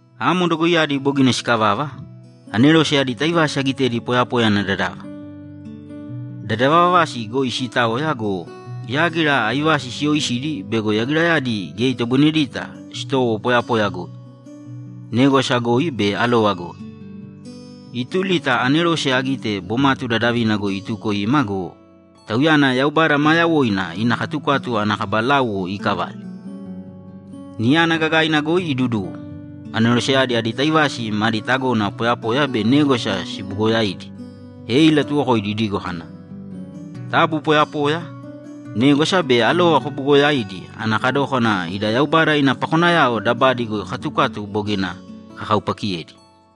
Amo dogoiyadi bogina sikavava, anerose adi taivasi agitedi poyapoya ana dadava; dadavavasi goi siitaoya go, yágira aivasi siyooisidi bego yagirayadi geya itoboinedita sitowo poyapoya goi, négwasa goi be alova goi. Ituli ta anerose agite bomatu dadavina goi ituko ima go, tauyana Yaubada maa yawoina ina katukatu ana kaba láuwo iikavale. Niyana gagaina goi iduduwo, aneroseyadi adi taivasi madi tagona poyapoya be négwasa sibuugoyaidi, e ilatuwokoidi idigo kana, ‘Taabu poyapoya, négwasa be alova kobuugoyāidi ana kadókana ida Yaubada ina pakonayao dabadi goi katukatu bogina kakaupakiyedi!’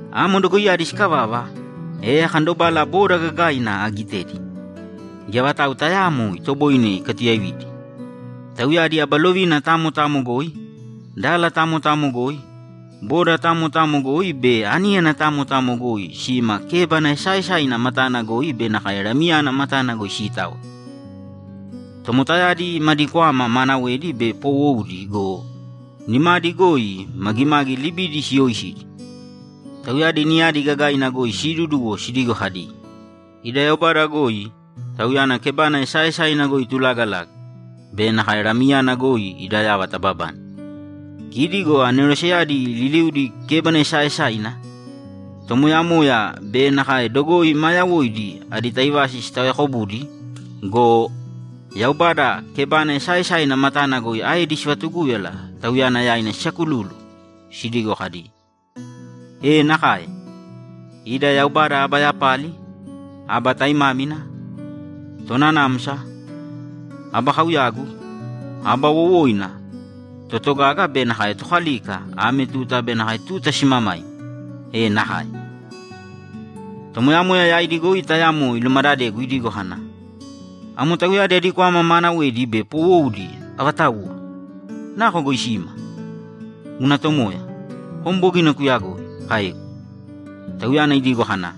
Amo dogoiyadi sikavava, e akandobala boda gagaaina agitedi. Geya vatau tayaamo itoboine ikatuyaividi. Tauyadi aba lovina tamo tamo goi, dala tamo tamo goi, boda tamo tamo goi be aníyana tamo tamo goi sima kébana esaaesaina matana goi be nakae Lamiyana matana goi siitaoya. Tomotayadi madi kwama maanawedi be poowoudi go, nimadi goi magimagi libidi siyooisidi. Tauyadi niyadi gagaina goi siiduduwo sidigo kadi, ‘Ida Yaubada goi, Tauyana kebana esaaesaina goi itulagalaga, be nakae Lamiyana goi ada yava tababane!’ Kidi go aneroseyadi liliudi kébana esaaesaina, tomoyamoya be nakae dogoi maa yawoidi adi taivasi sitaoyaakobudi go, Yaubada kebana esaaesaina matana goi aedi sivatugúyala Tauyana yaina sisakululu, sidigo kadi, ‘E nakae! Ida Yaubada aba yapali, aba taimámina, tonanamsa, aba kauyagu, aba wowoina, totogaga be nakae tokalika ame tuta be nakae tuta simamaima! E nakae!’ Tomoyamoya yaidi goi tayamo ilumadadegu idigo kana, ‘Amo tauyadi adi kwama maanawedi be poowoudi avatauwa? Nako goi sima?’ ‘Guna tomoya, kom bogina kuyagoi’, kaegu. Tauyana idigo kana,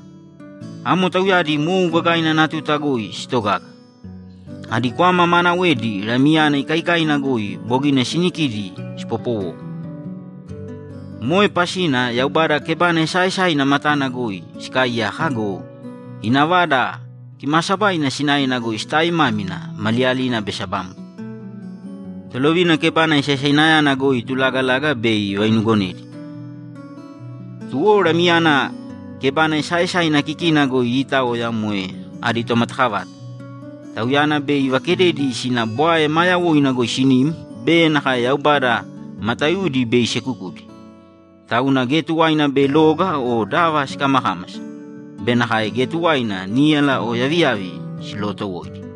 ‘Amo tauyadi mou gagaina ana tuta goi sitogaga. Adi kwama maanawedi Lamiyana ikaikaina goi bogina sinikidi sipopowou. Moe pasina Yaubada kebana esaaesaina matana goi sikaaiyaka go, ina Vada Kimaasabaina sinaena goi sitaaimámina maliyalina be sabamgo. Tolovina kebana esaesainayana goi itulaagalaga bei ivainuugonedi. Tuwo Lamiyana kebana esaaesaina kikina goi iitaoya moe adi tomatakavata. Tauyana bei ivakededi sina bwae maa yawoina goi sinim be nakae Yaubada mataiudi bei isekukudi. Tauna geya tuwaina bei loga o dava sikamakámasa be nakae geya tuwaina níyala o yaviyavi silootowoidi.’